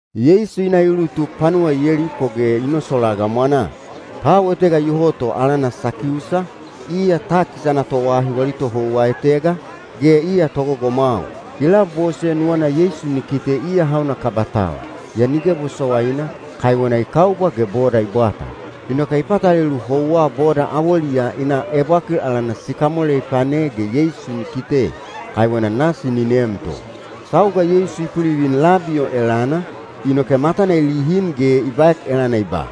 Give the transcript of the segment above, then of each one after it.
Yeisu i na i ulutuk panuwa Yeliko ge ni nosolaa gamwanaa. Tau etega iyoho to alana Sakiusa, iya takis ana toahi wali tohouwa etega, ge iya togogomwau. I labose nuwana Yeisu ni kite iya hauna kaba tau, yaa nige bosowaina, kaiwena i kaubwa ge boda i bwata. Inoke i patalelu houwa boda awoliyaa i na ebwakil alana sikamole i pane ge Yeisu ni kite, kaiwena nasi ni neem to. Sauga Yeisu i pulivin labi o elana, inoke matana i lihin ge i baek elana i ba,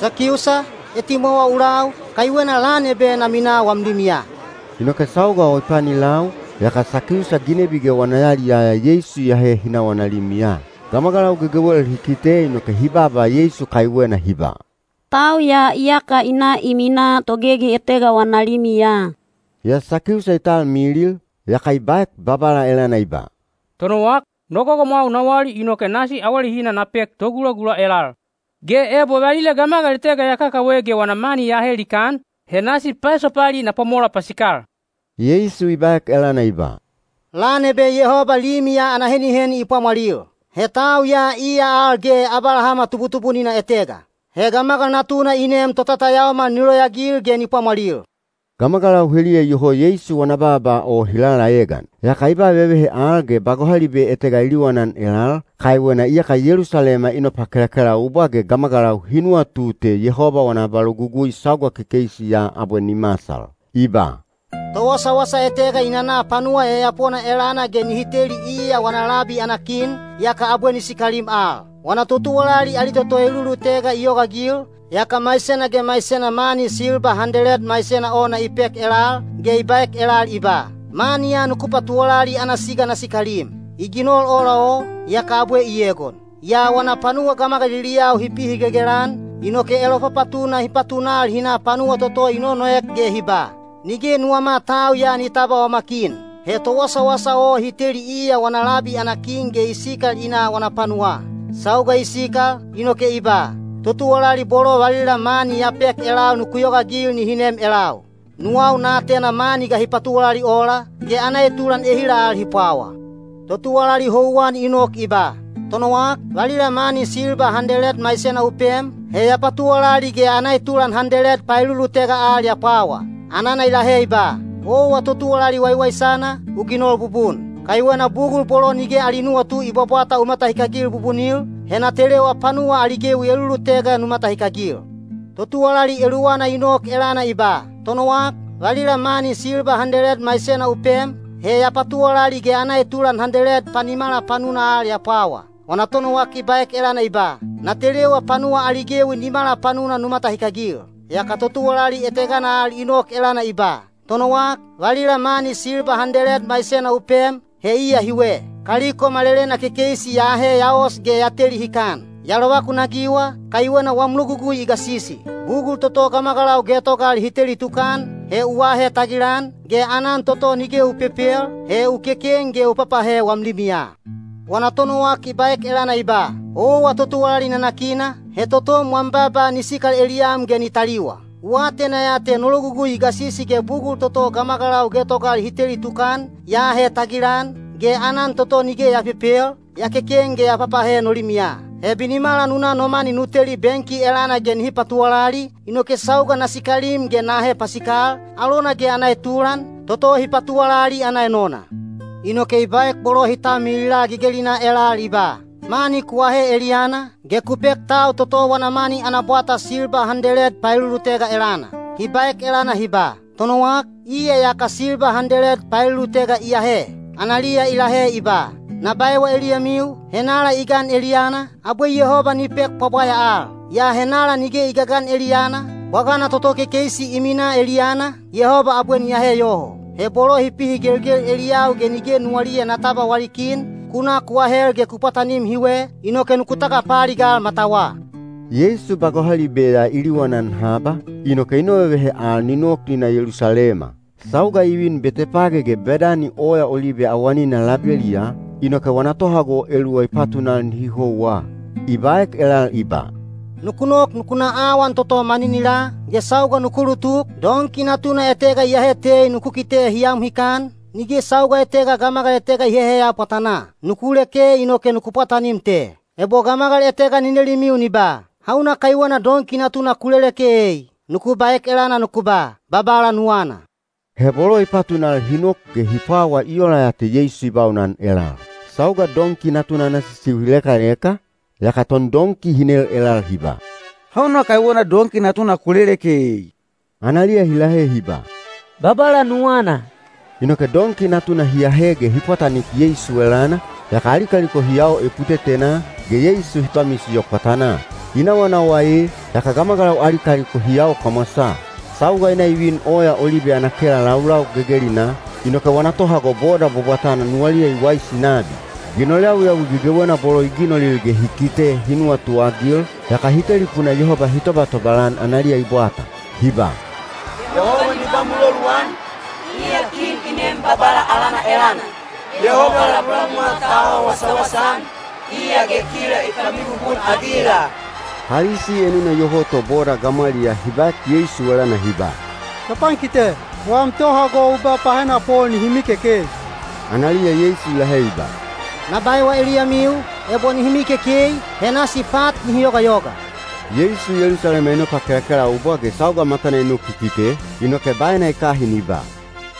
“Sakiusa, etimwawa u lau, kaiwena lan ebe na minaa wam limiya.” Inoke sauga o i pani lau, yaka Sakiusa ginebi ge wana yaliyaya Yeisu i ahe hi na wana limiya. Gamagalau gegewel hi kite inoke hi baaba Yeisu kaiwena hi ba, “Tau ya iyaka i na i minaa togegi etega wana limiya.” Yaa Sakiusa i talmilil, yaka i baek Babala elana i ba, “Tonowak, no gogomwau na wali inoke nasi awalehina na pek togulagula elal. Ge ebo valila gamagal etega ya kakawe ge wana mani ya ahe likaan, he nasi paesopali na pwamola pasikal.” Yeisu i baek elana i ba, “Lan ebe Yehoba limi ya ana heniheni i pwamwalil. He tau ya iya al ge Abalahama tubutubunina etega. He Gamagal Natuna i nem totatayaomal ni loyaagil ge ni pwamwalil.” Gamagalau heliya iyoho Yeisu wana baaba o hi lalaegan. Yaka i ba vevehe al ge ba gohalibe etega i liwanan elal, kaiwena iyaka Yelusalema i nopakelakelaubwa ge gamagalau hi nuwatu te Yehoba wana abalogugui sauga kekeisi ya abwe ni masal. I ba, “Towasawasa etega i nana panuwa yayapona elana ge nihi teli iya wana labi ana kin, yaka abwe ni sikalim al. Wana totuwalali ali toto elulutega i yogaagil, yaka maisena ge maisena mani silba handeled maisena ona i pek elal, ge i baek elal i ba, ‘Mani ya nuku patuwalali ana siga na sikalim.’ I ginol ola o, yaka abwe i egon. Yaa wana panuwa gamagaliliyau hi pihigelgel-an, inoke elopapatuna hi patunal hi na panuwa toto i nonoek ge hi ba, ‘Nige nuwama tau ya ni tabwa wama kin.’ He towasawasa o hi teli iya wana labi ana kin ge i sikal i na wana panuwaa. Sauga i sikal, inoke i ba, ‘Totuwalali bolo valila mani ya pek elal nuku yogaagil nihi nem elau. Nuwau na atena mani ga hi patuwalali ola, ge ana etulan ehila al hi pwawa.’ Totuwalali houwan i nok i ba, ‘Tonowak, valila mani silba handeled maisena u pem, he ya patuwalali ge ana etulan handeled paelulutega al ya pwawa.’ Anana i lahe i ba, ‘Owa totuwalali waiwaisana, u ginol bubun. Kaiwena bugul bolo nige ali nuwatu i bwabwata u matahikagil bubunil, he na telewa panuwa ali gewi elulutega nu matahikagil.’ Totuwalali eluwana i nok elana i ba, ‘Tonowak, valila mani silba handeled maisena u pem, he ya patuwalali ge ana etulan handeled panimala panuna al ya pwawa.’ Wana tonowak i baek elana i ba, ‘Na telewa panuwa ali gewi nimala panuna nu matahikagil.’ Yaka totuwalali etegana al i nok elana i ba, ‘Tonowak, valila mani silba handeled maisena u pem, he iya hiwe. Kaliko malelena kekeisi ya ahe ya os ge ya teli hikan. Ya lovakunagiwa, kaiwena wam logugui i gasisi. Bugul toto gamagalau getogal hi teli tukan, he u aahe tagilan, ge aanan toto nige u pepel, he u keken ge u papahe wam limiya.’ Wana tonowak i baek elana i ba, ‘Owa totuwalali nanakina, he totom wam baaba ni sikal eliyam ge ni taliwa. U atena ya te no logugui i gasisi ge bugul toto gamagalau getogal hi teli tukan, ya aahe tagilan, ge aanan toto nige ya pepel, ya keken ge ya papahe no limiya. He binimala nu na no mani nu teli benki elana ge nihi patuwalali, inoke sauga na sikalim ge na ahe pasikal, alona ge ana etulan, toto hi patuwalali ana enona.’ Inoke i baek bolo hi talmilila gegelinaa elal i ba, ‘Mani ku ahe eliyana, ge ku pek tau toto wana mani ana bwata silba handeled paelulutega elana.’ Hi baek elana hi ba, ‘Tonowak, iya iyaka silba handeled paelulutega i ahe.’ Analiya i lahe i ba, ‘Na baewa eliyamiu, henala i gan eliyana, abwe Yehoba ni pek pwabwaya al. Yaa henala nige i gagan eliyana, bwagana toto kekeisi i minaa eliyana, Yehoba abwe ni ahe yoho. He bolo hi pihigelgel eliyau ge nige nuwaliya na tabwa wali kin, ku na ku ahel ge ku pwatanim hiwe, inoke nuku tagapaaligal matawa.’” Yeisu ba gohalibe ya i liwanan haba, inoke i novevehe al ni nok ni na Yelusalema. Sauga i vin Betepage ge Bedani Oya Olibe awanina labeliyaa, inoke wana tohago eluwa i patunal nihi houwa. I baek elal i ba, “Nuku nok nuku na awan toto maninilaa, ge sauga nuku ulutuk, donki natuna etega iyahe tei nuku kite hi am hikan, nige sauga etega gamagal etega i heheya pwatanaa. Nuku leke inoke nuku pwatanim te. Ebo gamagal etega ni nelimiu ni ba, ‘Hauna kaiwena donki natuna ku leleke ei?’ nuku baek elana nuku ba, ‘Babala nuwana.’” He bolo i patunal hi nok ge hi pwawa i ola ya te Yeisu i baunan elal. Sauga donki natuna ana sisiu hi lekaleka, yaka tondonki hi nel elal hi ba, “Hauna kaiwena donki natuna ku leleke ei?” Analiya hi lahe hi ba, “Babala nuwana.” Inoke donki natuna hi ahe ge hi pwatanik Yeisu elana, yaka ali kaliko hi yao eputetenaa, ge Yeisu hi pamisiyo pwatanaa. I nawanawa ee, yaka gamagalau ali kaliko hi yao kamwasaa. Sauga i na i vin Oya Olibe ana kela laulau gegelinaa, inoke wana tohago boda bwabwatana nuwaliya i waisi nabi. Ginol yawiyawi gegewena bolo i ginolil ge hi kite hi nuwatuagil, yaka hi telipuna Yehoba hi tobatobal-an analiya i bwata. Hi ba, “Yehoba ni ba muloluan, iya kin i nem Babala alana elana! Yehoba labulabumwa ta awa wasawasa-an, iya ge kila i pamibubun-agila!” Palisi enuna iyoho to boda gamwaliyaa hi baek Yeisu elana hi ba, “Topankite, wam tohago u ba pahenapol nihi mikekei.” Analiya Yeisu i lahe i ba, “Na baewa eliyamiu, ebo nihi mikekei, he nasi pat nihi yogayoga.” Yeisu Yelusalema i nopakelakelaubwa ge sauga matana i nok i kite, inoke baena i kahin i ba,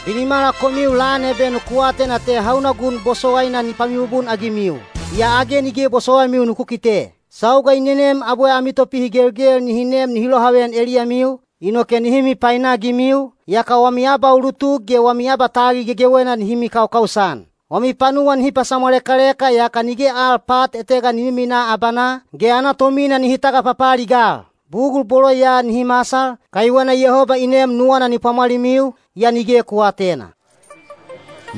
“Binimala komiu lan ebe nuku atena te hauna gun bosowaina ni pamibubun-agimiu. Yaa age nige bosowaimiu nuku kite. Sauga i nenem abwe ami topihigelgel nihi nem nihi lohaveyan eliyamiu, inoke nihi mipainagimiu, yaka wami abaulutuk ge wami abatagil gegewena nihi mikaukaus-an. Wami panuwa nihi pasamwalekaleka yaka nige al pat etega ni miminaa abanaa, ge ana tomina nihi tagapapaaligal. Bugul bolo ya nihi masal, kaiwena Yehoba i nem nuwana ni pwamwalimiu, yaa nige ku aatena.”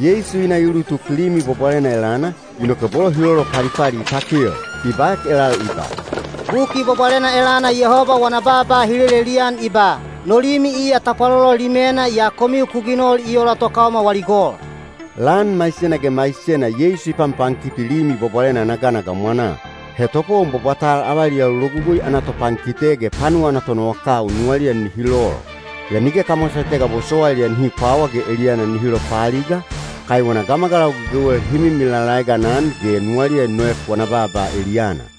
Yeisu i na i ulutuk Limi Bwabwalena elana, inoke bolo hi lolopalipali i takel. I baek elal i ba, “Buki Bwabwalena elana Yehoba wana baaba hi lelelian i ba, ‘No limi iya tapwalolo limena’ yaa komiu ku ginol i ola tokaoma wali gol.” Lan maisena ge maisena Yeisu i panpankiti Limi Bwabwalena ana gana gamwanaa. He topowon bwabwatal avaliyau Logugui ana topankite ge panuwa ana tonowakau nuwaliya nihi lol. Yaa nige kamwasa etega bosowailiya nihi pwawa ge eliyana nihi lopaaliga, kaiwena gamagalau gegewel hi mimi lalaegan-an ge nuwaliya i noek wana baaba eliyana.